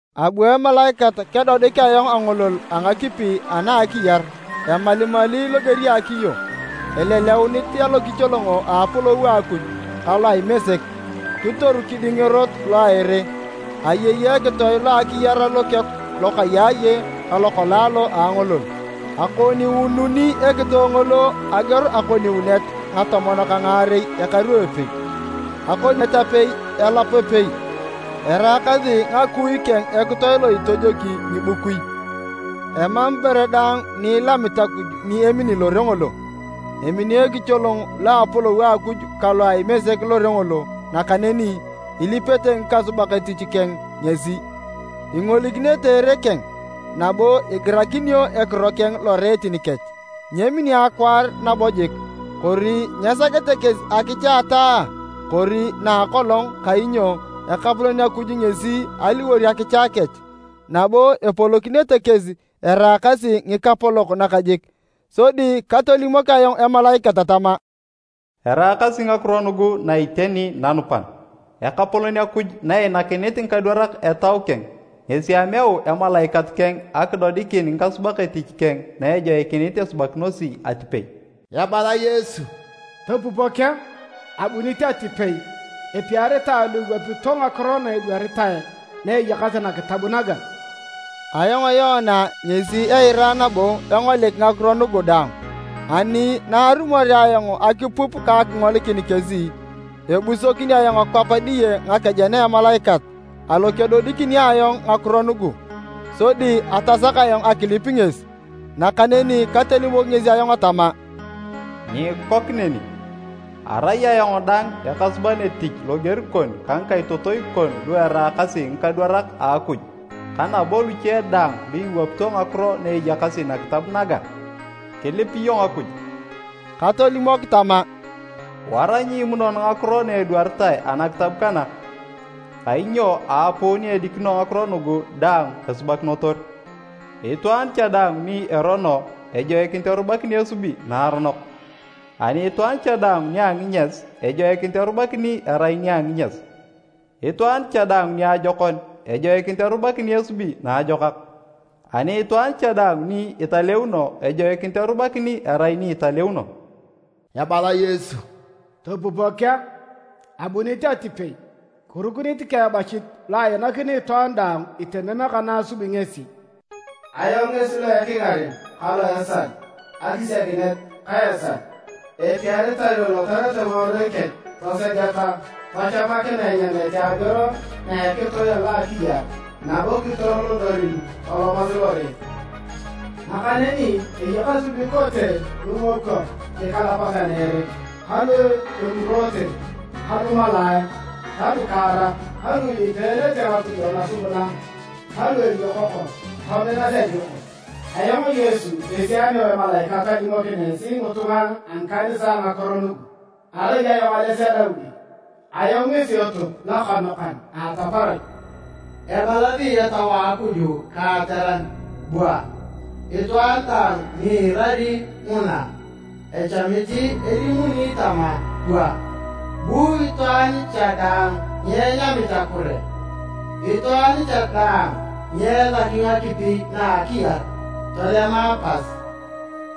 Abu emalaikat kedodik ayong angolol a ngakipi ana a akiyar emalimali loger a akiyo, eleleunit alokicholong a apolou a Akuj ka loa Imesek. Kitoru kiding erot lo a ere. Ayei ekitoe lo akiyar lokeku lokayaaye ka lokalaalo a angolol, akoniununi ekitoe ngolo ageor akoniunet ngatomon ka ngaarei ekaru epei, akoniet apei, elap epei. Eraakasi ngakui keng ekitoe lo itojoki ngibukui. Emam ibore daang ni ilamit Akuj ni emini lore ngolo. Emini ekicholong lo a apolou a Akuj ka lo a Imesek lore ngolo nakaneni ilipete ngikasubak etich keng ngesi. Ingolikinete ereet keng, nabo igirakinio ekiro keng loreetin kech. Nyemini akwaar nabo jik, kori nyesakete kesi akicha a ataa kori na a akolong kainyo Ekapolon Akuj ngesi eliwor akicha kech, nabo epolokinete kesi eraakasi ngikapolok nakajik. Sodi katolimok ayong emalaikat tama, “Eraakasi ngakiro nugu na iteni nanupan. Ekapolon Akuj na einakinit ngikadwarak Etau keng, ngesi ameu emalaikat keng akidodikin ngikasubak etich keng na ejoikinit esubakinosi atipei.” Ebala Yesu, “Topupok a! Abunit atipei! Epiaritae lu iwapito ngakiro na edwaritae na eyakasi nakitab naga!” Ayong Yoana ngesi eira nabo engolik ngakiro nugu daang. Ani na arumorea ayong akipup ka akingolikin kesi, ebusokin ayong kwap diye ngakejen a emalaikat alo kedodikini ayong ngakiro nugu, sodi atasak ayong akilip ngesi. Nakaneni katolimok ngesi ayong tama, “Nyiikok neni! Arai ayong dang ekasuban etich loger kon ka ngikaitotoi kon lu eraakasi ngikadwarak a Akuj ka nabo luche daang lu iwapito ngakiro na eyakasi nakitab naga. Kilip iyong Akuj!” Katolimok tama, “Wara nyiimunon ngakiro na edwaritae anakitab kana kainyo aapuu ni edikino ngakiro nugu daang esubakinotor. Itwaan cha daang ni erono, ejoikinit erubakini esubi naaronok, ani itwaan cha daang nia nginyas, ejoikinit erubakini erai nia nginyas. Itwaan cha daang niajokon, ejoikinit erubakini esubi naajokak, ani itwaan cha daang ni italeuno, ejoikinit erubakini erai ni italeuno.” Ebala Yesu, “Topupok a! Abunit atipei, kirukunit ka ebachit lo ainakini itwaan daang itemem ka na asubi ngesi. Ayong ngesi lo ekingaren ka lo a esal, akisiakinet ka esal.” Epiaritae lu ilotarete ngiworui kech tosegeta tachamakinae enyamete ageor na a ekitoe alo a akiyar nabo kitoro lodorin tolomasi lore. Nakaneni eyakasi lu ikote ngingokwo nikalapatan a ere, ka lu emuroote, ka lumalaae ta lukaarak, ka lu ilipeenete ngakujo nasubuna ta lu eliokoko, tominas alioko. “Ayong Yesu ngesi ameu emalaikat alimokin esi ngitunga a ngikanisae ngakiro nugu. Arai ayong ales a Daudi, ayong ngesi etop lokanokan a ataparach.” Ebalasi Etau a Akuj ka ateran, “Bua!” Itwaan daang ni iirari nguna, echamit elimuni tama, “Bua!” Bu itwaan cha daang ni enyamit akure. Itwaan cha daang ni esaki ngakipi na akiyar, tolema pas.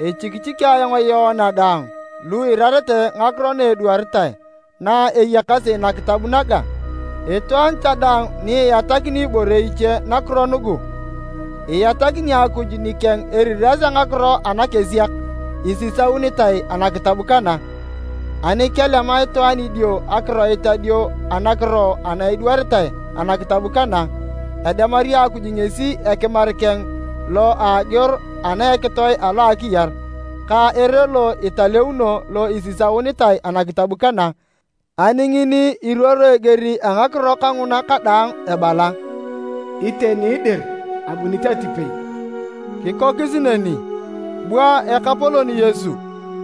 Echikichiki ayong Yoana daang lu iirarete ngakiro na edwaritae na eyakasi nakitab naga, itwaan cha daang ni iatakini ibore iche nakiro nugu, iatakini Akuj nikeng eriras a ngakiro anakesiak isisaunitae anakitab kana. Ani kelema itwaan idio akiroit adio anakiro ana edwaritae anakitab kana, edemari Akuj ngesi ekimar keng lo a ageor ana a ekitoe alo a akiyar, ka ere lo italeuno lo isisaunitae anakitab kana. Ani ngini iruoro eger a ngakiro kanguna kadaang ebala, “Iteni dir! Abunit atipei!” Kikokis neni. Bua Ekapolon Yesu!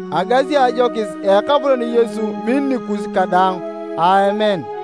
Agasi ajokis a Ekapolon Yesu min nikus kadaang. Aamen.